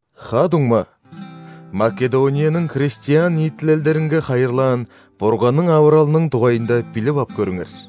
Ха-дуңма, Македонияның христиан ниитилелдеринге хайырлаан Бурганның авыралының дугайында билип ап көрүңер.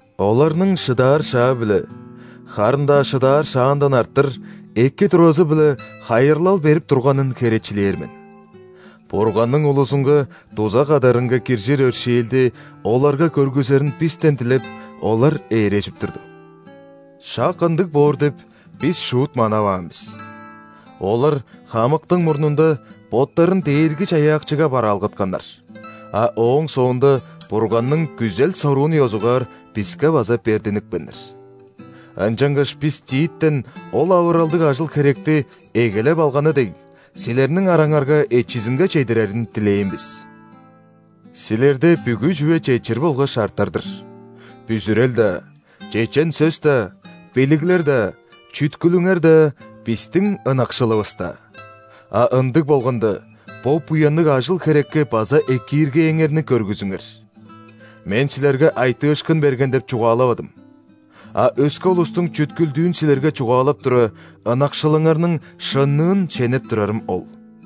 Оларның шыдаар шаа-биле, харын-даа шыдаар шаандан арттыр, эки туразы-биле хайырлал берип турганын херечилээр мен. Бурганның улузунга дуза кадарынга киржир өршээлди оларга көргүзерин бистен дилеп, олар ээрежип турду. Шак ындыг боор деп, бис шуут манаваан бис! Олар хамыктың мурнунда боттарын Дээрги-Чаяакчыга бараалгатканнар, а ооң соонда Бурганның күзел-соруун ёзугаар биске база бердинипкеннер. Ынчангаш бис Титтен ол авыралдыг ажыл-херекти, эгелеп алганы дег, силерниң араңарга эчизинге чедирерин дилээн бис. Силерде бүгү чүве четчир болгаш артар-дыр: бүзүрел-даа, чечен сөс-даа, билиглер-даа, чүткүлүңер-даа, бистиң ынакшылывыс-даа. А ындыг болганда, бо буянныг ажыл-херекке база экииргээңерни көргүзүңер. Мен силерге айтыышкын берген дег чугаалавадым. А өске улустуң чүткүлдүүн силерге чугаалап тура, ынакшылыңарның шынныын шенеп турарым ол.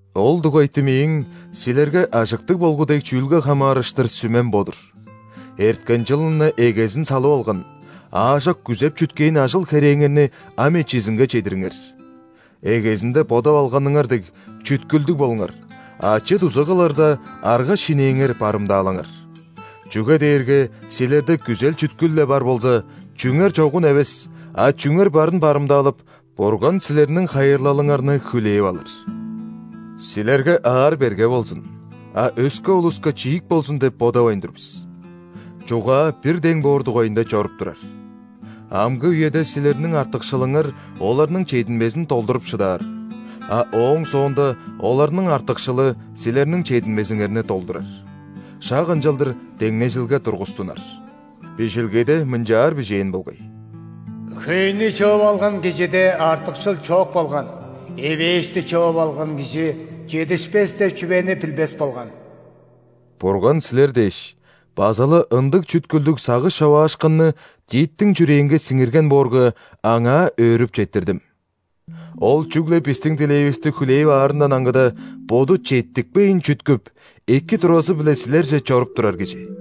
Ол дугайты мээң, силерге ажыктыг болгу дег чүүлге хамаарыштыр, сүмем бо-дур: эрткен чылын-на эгезин салып алган, аажок күзеп-чүткээн ажыл-херээңерни ам эчизинге чедириңер. Эгезинде бодап алганыңар дег, чүткүлдүг болуңар, ачы-дуза кылырда, арга-шинээңер барымдаалаңар. Чүге дээрге силерде күзел-чүткүл-ле бар болза, чүңер чогун эвес, а чүңер барын барымдаалап, Бурган силерниң хайырлалыңарны хүлээп алыр. Силерге аар-берге болзун, а өске улуска чиик болзун деп бодавайн тур бис. Чугаа бир дең боор дугайында чоруп турар. Амгы үеде силерниң артыкшылыңар оларның чединмезин долдуруп шыдаар, а ооң соонда оларның артыкшылы силерниң чединмезиңерни долдурар. Шак ынчалдыр деңнежилге тургустунар. Бижилгеде мынчаар бижээн болгай:«Хөйнү чыып алган кижиде артыкшыл чок болган;эвээшти чыып алган кижи чедишпес деп чүвени билбес болган». Бурган силер дээш, база-ла ындыг чүткүлдүг сагыш човаашкынны Титтиң чүрээнге сиңирген боорга, Аңаа өөрүп четтирдим. Ол чүгле бистиң дилээвисти хүлээп аарындан аңгыда, боду четтикпейн чүткүп, эки туразы-биле силерже чоруп турар кижи.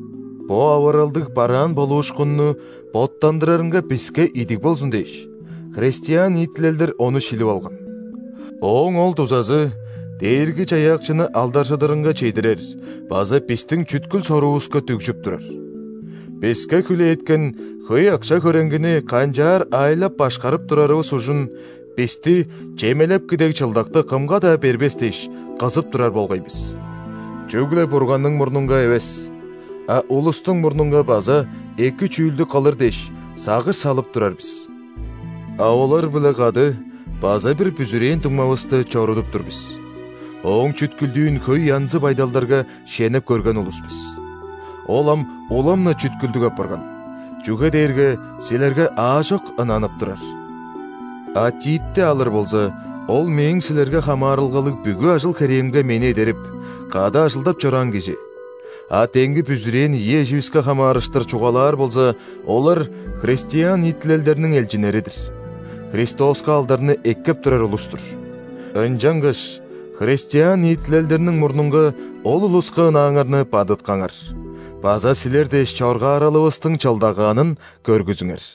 Бо авыралдыг бараан болуушкунну боттандырарынга биске идиг болзун дээш, христиан ниитилелдер ону шилип алган. Ооң ол дузазы Дээрги-Чаяакчыны алдаржыдарынга чедирер база бистиң чүткүл-соруувуска дүгжүп турар. Биске хүлээткен хөй акша-хөреңгини канчаар аайлап-башкарып турарывыс ужун бисти чемелепки дег чылдакты кымга-даа бербес дээш, кызып турар болгай бис. Чүгле Бурганның мурнунга эвес, а улустуң мурнунга база эки чүүлдү кылыр дээш, сагыш салып турар бис. А олар-биле кады база бир бүзүрээн дуңмавысты чорудуп тур бис: ооң чүткүлдүүн хөй янзы байдалдарга шенеп көрген улус бис. Ол ам улам-на чүткүлдүг апарган, чүге дээрге силерге аажок ынанып турар. А Титти алыр болза, ол мээң силерге хамаарылгалыг бүгү ажыл-херээмге мени эдерип, кады ажылдап чораан кижи; а демги бүзүрээн ийи эживиске хамаарыштыр чугаалаар болза, олар – христиан ниитилелдерниң элчиннери-дир, Христоска алдарны эккеп турар улус-тур. Ынчангаш христиан ниитилелдерниң мурнунга ол улуска ынааңарны бадыткаңар база силер дээш чоргааралывыстың чылдагаанын көргүзүңер.